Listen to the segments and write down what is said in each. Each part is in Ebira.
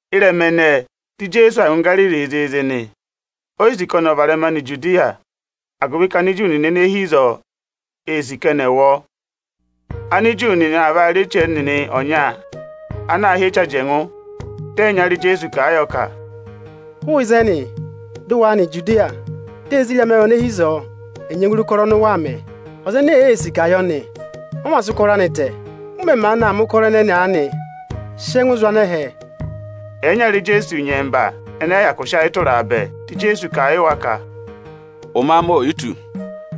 Ịrẹma ẹnẹẹ, di Ijeesu aa ngụ Igariri zịịzị nị. O yi sì ka ọnị ọ̀ varẹma nọ Ijudiya, agụvị ka Aniju nịnị ene hi ịzọọ, ee sì ka ẹnị ẹ̀ wụ ọ. Aniju nịnị aa vaa rị eche ẹnịnị ọnya ana aā hị́ Eche Ajẹngụ. Dị ẹyịnyara Ijeesu kà a yọ ka, “Hụụ ịzẹnị, dị ụ wa nọ Ijudiya, di ezirẹma awụ ene hi ịzọọ ẹ̀ nyẹngụ re ụkọrọ ọnị ụ waa mẹ! Ọza ene èee sì ka eyi ọ̀ yẹ ọnị, ọ mā sị ụkọrọ anị tẹ. Ụ mẹ̀ maanị aa mẹ̀ ụkọrọ ẹnẹnị aanị, sị ẹngụ awụ zụ̀ anẹhẹ dị è re e!” Ẹyịnyara Ijeesu ịnyẹmba ẹnị ẹyị hyakụ sị ayị tụra a bẹẹ. Dị Ijeesu kà a yị wa ka, “Ụmẹ amị o yi tù,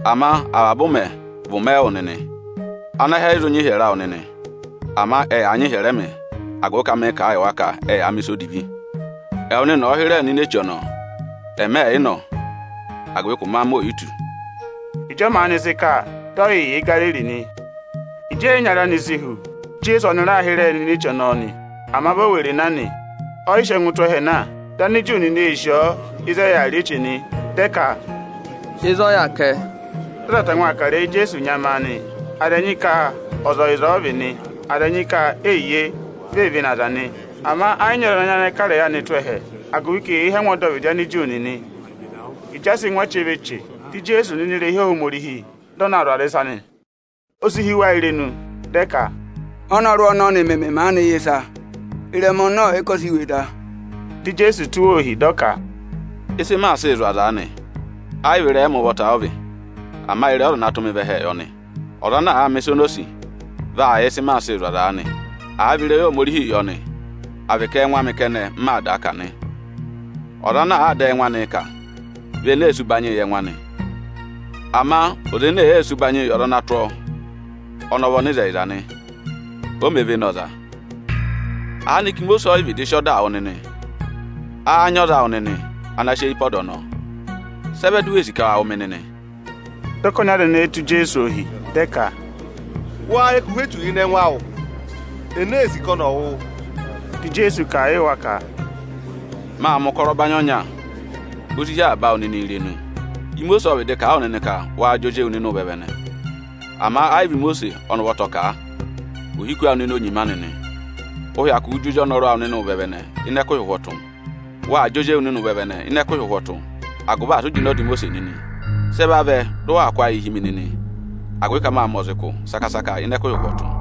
ama avaba ụmẹ vị ụmẹ ẹwụ nịnị. Anẹhẹ ẹ yị zụ nyị ịhyẹrẹ awụ nịnị, ama ẹyaa nyị ịhyẹrẹ ẹmị, agụvị ka mịị̄ kà a yị wa ka ẹ yaa mẹ̀ ịsa odivi. Ẹwụ nịnị ọ̀ọ hịrẹẹ nọ ini eche ọnọọ! Ẹmị ẹ̀ yị nọ, agụvị ka ụmẹ amị oò yi tù.” Ịjị ọ maanị sị kà, dị ọ yị yà Igariri nị. Ịjị ẹyịnyara anị si hu, dị Ijeesu ọnị raa hịrẹẹ nọ ini eche ọnọọ nị. Ama vi o were na nị, ọ yị sị ẹngụ tụ́ ẹhẹ na ọ maa na. Dị Aniju nịnị ee sì ọọ ịzị ẹ yà rị eche nị. Dị ẹ ka, “Ịzị ọ yà kẹ?” Dị aza tangwa aa kà ịrẹyị Ijeesu nyamaa nị. Aza ẹnyị ka ọza ọyịza ọ vị nị; aza ẹnyị ka eyiye, vi ee vene aza nị. Ama ẹ yị nyị ọza ana nyayịnẹ kà ịrẹyị anị tụ́ ẹhẹ, agụvị ka eyee hí angwa ọdọvịdị Aniju nịnị. Ịjị a sị ngụ achẹva eche, dị Ijeesu nọ ini irehi Ohomorihi, dị ọ na zụ̀ aza ịsa nị. O si hí wa irenu, dị ẹ ka, “Ọ́nọrụ ọnọnị mẹmẹ maanị yẹ ịsa, ịrẹma ọnọ ọ̀ yị kọsẹ iwe da?” Dị Ijeesu tụ́ wa ohi, dị ọ ka, “Ịsị maa sịị zụ̀ aza aanị, ẹ yị vị ịrẹyị ẹmị ụvọta ọ vị, ama ịrẹyị Ọza ana tụ́ mị vẹ ẹhẹẹ yọ nị. Ọza ana àa mẹ̀ ịsa ọnị o sì, vaa yẹ ịsị maa sịị zụ̀ aza aanị, àa vị ịrẹyị Ohomorihii yọ nị, à vị ka ẹ́ẹngụ amị kẹnẹ m maa dàa kà nị. Ọza ana àaa dà ẹngụ anịị kà, vị ene ee sì ụbanyị yị ẹngụ anị. Ama ọza ene èee sì ụbanyịị yị ọza ana tụ́ ọọ, ọnị ọ vị ọnịzẹyịza nị, o mē vene ọza. Aanịka Imosiisi ọ yị vịdị sị ọdaa wụ nịnị? Áá nyị ọza awụ nịnị ana saasa ọda ọnọọ? Sị ẹ vẹ di u wee sì ka wa wụ̀ mị nịnị?” Dị ọkọnị aza ẹnẹẹ tụ́ Ijeesu ohi, dị ẹ ka, “Wáá yẹ ka ụhwẹ echu yà ịnị ẹngụ awụ? Ene ee sì ka ọnị ọ̀ wụ wụ?” Dị Ijeesu kà a yị wa ka, “Mâ mẹ̀ ụkọrọ ọbanyị ọnya, o si hí avaba awụ nịnị irenu. Imosiisi ộ vịdị kà a wụ nịnị ka waa jị ozi ewu nịnị ụvẹvẹnẹ, ama ẹ yị vị Imosiisi ọnị ụvọta ọ kà a, ohiku awụ nịnị o nyima anị nị. Ụụ̄ hyakụụ jị ozi ọnọrụ awụ nịnị ụvẹvẹnẹ ịnị ẹkụhị ụhwọtụ. Waa jị ozi ewu nịnị ụvẹvẹnẹ ịnị ẹkụhị ụhwọtụ, agụvị asị ụ jịnẹ ọda Imosiisi nịnị. Sị ẹ vavẹ dị ụ waa kụ́ ayịị hi mi nịnị, agụvị ka mâ mẹ ọza ụkụ saka-saka ịnị ẹkụhị ụhwọtụ?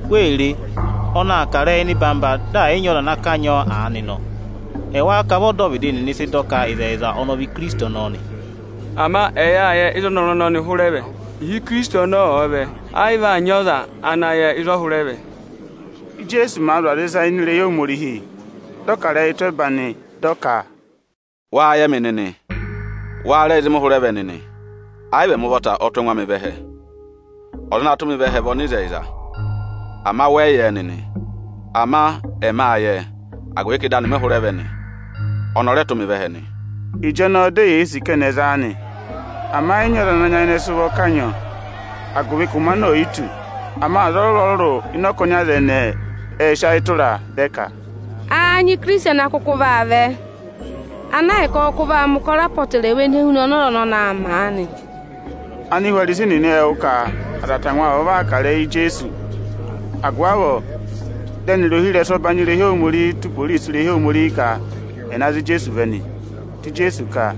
Wee re! Ọnị aa kà ịrẹyị eyi ịnọyị-ịnọyị, dị ẹ̀ yị nyị ọza ana kanyị ọọ aanị nọ! Ẹwáá ka vị ọdọvịdị nịnị sị dọ ka ịzẹyịza ọnị ọ vị Ikirisiti ọnọọ nị? Ama ẹ yâ yẹ ịzị ọnọrụ ọnọnị hụrẹ vẹ. Ịhị Ikirisiti ọnọọ ọ̀ọ vẹ, ẹ yị vaa nyị ọza ana yẹ ịzọọ hụrẹ vẹ.” Íjeesu màa zụ̀ aza ịsa ini irehi Ohomorihi, dị ọ kà ịrẹyị tụ́ ẹba nị, dị ọ ka, “Wáá yẹ mị nịnị? Wáá rẹ yẹ ịzị mị hụrẹ vẹ nịnị? Ẹ yị vị ẹmị ụvọta ọ tụ́ ẹngụ amị vẹ ẹhẹ. Ọza ana tụ́ mị vẹ ẹhẹ vị ọnịzẹyịza; ama wẹ yị yẹ ẹ nịnị. Ama ẹmị â yẹ ẹ, agụvị ka ịdị anị mị hụrẹ vẹ nị; ọnị ọ rẹ tụ́ mị vẹ ẹhẹ nị.” Ịjọnọọ di eyee sì ka ẹnị ẹ̀ za a nị; ama ẹ yị nyị ọza ana sị ụvọ kanyị ọọ, agụvị ka ụmẹ anị oò yi tù. Ama aza ọrụrụ-ọrụrụ ịnị ọkọnị aza ẹnẹẹ ệ sị ayị tụra a, dị ẹ ka, “Áá nyị Ikirisiti ana kụkụ vaa vẹ, ana ahịka ọ kụkụ vaa mẹ̀ ụkọrọ apọtẹrẹwa ene huna ana ọza ọnọnị aa mẹ aanị?” Anihwarisi nịnị ệ wụ́ ka aza tangwa vavọọ aa kà ịrẹyị Ijeesu. Agụvị avọọ dị ẹnịrị ohirẹsụ ẹbanyị irehi Ohomorihi tụ́ iporisi irehi Ohomorihi ka ẹ̀ na za Ijeesu vẹ nị. Dị Ijeesu ka,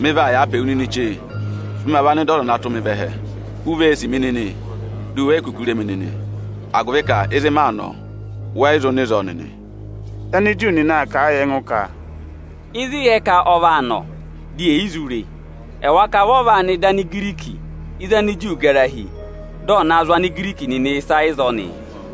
“Mị vaa yàa pe wu nịnị chee, dị ma va nọ ịdị Ọza ana tụ́ mị vẹ ẹhẹ. U vee sì mi nịnị, di u we yi kuku re mi nịnị; agụvị ka ịzị maa nọ, wẹ yị zụ nọ ịzọọ nịnị.” Dị Aniju nịnị aa kà a yị ẹngụ ka, “Ịzị ị yẹ ka ọ vaa nọ, di ye yi zụ re e? Ẹwáá ka vị ọ vaa nọ ịdị Anigiriki ịzị Aniju gara hi, dị ọ̀ naa zụ̀ Anigiriki nịnị ịsa ịzọọ nị?”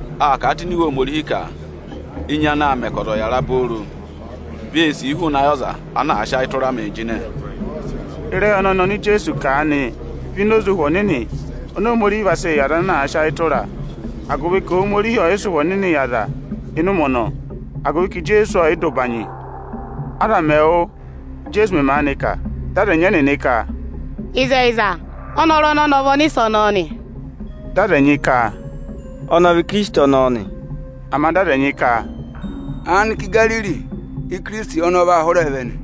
Â kà a tụ́ ini Iwe Ohomorihi ka enyi anaā mẹ ka ọza ọ̀ yàra obooro, vee sìi hụụnị ayị ọza ana àa sị ayị tụra mịị jịnẹ.” Ịrẹyị ọnọnị oni Ijeesu kà aanị vị ịnị ịpa Ụhwẹ Ọnịnị, oni Ohomorihi vaa sị yị aza ana sị ayị tụra a, agụvị ka Ohomorihi ọọ̀ yị sị Ụhwẹ Ọnịnị yị aza ịnị ụmẹ ọnọọ, agụvị ka Ijeesu ọọ̀ yị dọ ụbanyị. Aza mẹ̀ wụ́, Íjeesu mẹ̀ maanị kà, dị aza ẹnyị ẹnịnị ka, “Ịzẹyịza, ọnọrụ ọnọnị ọ vị Ọnịsẹ ọnọọ nị.” Dị aza ẹnyị ka, “Ọnị ọ vị Ikirisiti ọnọọ nị.” Ama dị aza ẹnyị ka, “Aanịka Igariri Íkirisiti ọnọọ vaa hụrẹẹ vẹ nị?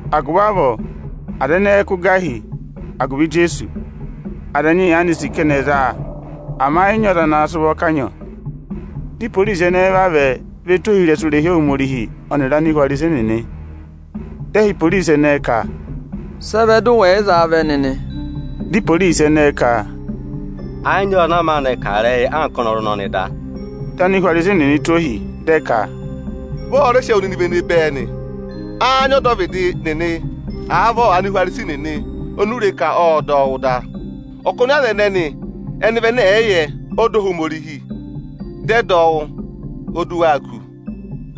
Agụvị avọọ aza ẹnẹẹ ẹ kụ́ gà hi agụvị Ijeesu. Aza ẹnyị yaanị sì ka ẹnị ẹ̀ za a, ama ẹ yị nyị ọza ana sị ụvọ kanyị ọọ. Dị iporisi ẹnẹẹ vavẹ ve tù ohirẹsụ irehi Ohomorihi ọnịrị Anihwarisi nịnị nị. Dị ẹ họ̀ iporisi ẹnẹẹ ka, “Sị ẹ vẹ dụ wẹ̀ yị za a vẹ nịnị?” Dị iporisi ẹnẹẹ ka, “Ẹẹ̀ yị nyị ọza ana maanị kà ịrẹyị anka ọnọrụ ọnọọ da o.” Dị Anihwarisi nịnị tụ́ ohi, dị ẹ ka, “Vị ọ́ọ́ rẹ sị ẹwụ nịnị vene bẹẹ nị? Áá nyị ọdọvịdị nịnị, àa vị Anihwarisi nịnị oni u re ka ộ dọ ọ wụ́ da? Ọkọnị aza ẹnẹnị ẹnị vị ẹnẹ ẹ̀ yị yẹ ọda Ohomorihi, dị ẹ dọ ọ wụ́, o du waa kù!”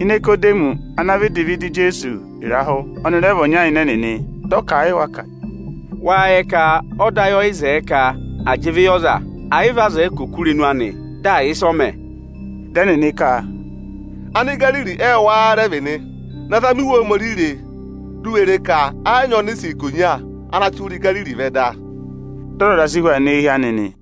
Inikodemọsị ana vịdị vẹ ịdị Ijeesu ịrahụ, ọnị rẹ vị ọnya ịnị ẹnịnị. Dị ọ kà a yị wa ka: “Wáá yẹ ka ọda ayị ọ yị zẹẹ ka à jị ịvị yị ọza, ẹ̀ yị vị a zẹẹ ka ọ̀ kụ́ irenu anị, dị à yẹ ịsị ọ mẹ?” Dị ẹnịnị ka, “Anigariri ẹwụ wáá rẹ vị nị? Na zama Iwe Ohomorihi re, di u we re ka ẹ̀ yị nyị ọnịsẹ ikonya ana chị hụrẹ Igariri vẹ da.” [Dị ọzọza si hu aa nọ eehi anị nị.